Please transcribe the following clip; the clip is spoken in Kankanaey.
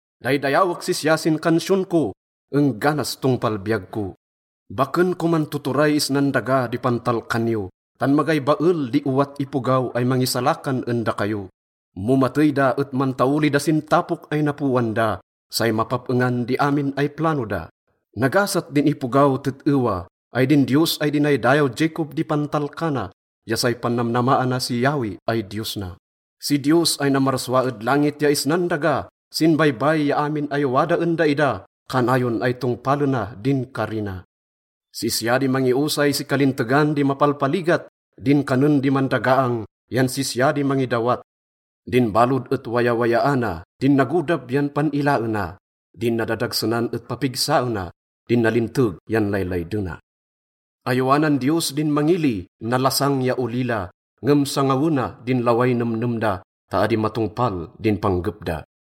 Daydayawek sisya sin kansiyon ko engganas tongpal biyag ko. Baken koman tuturay isnan daga di pantalkan yo, tan magay bael di owat ipogaw ay mangisalakan en dakayo. Mo matey da et mantaoli da sin tapok ay napoan da, say mapap-engan di amin ay plano da. Nagasat din ipogaw tet-ewa ay din Diyos ay dinaydayaw Jacob di pantalkana ya say pannamnamaana si Yahweh ay Diyos na. Si Diyos ay namarsua ed langit ya isnan daga, sin baybay ya amin ay wada en daida, kanayon ay tongpalena din kari na. Sisya di mangiosay si kalintegan di mapalpaligat, din kanen di mandagaang yan sisya di mangidawat. Din balod et wayawayaana, din nagodab yan pan-ilaena. Din nadadagsenan et papigsaena, din nalinteg yan laylaydena. Ayowanan Diyos din mangili, nalasang ya olila, ngem sangawena din laway nemnem da ta adi matongpal din panggep da.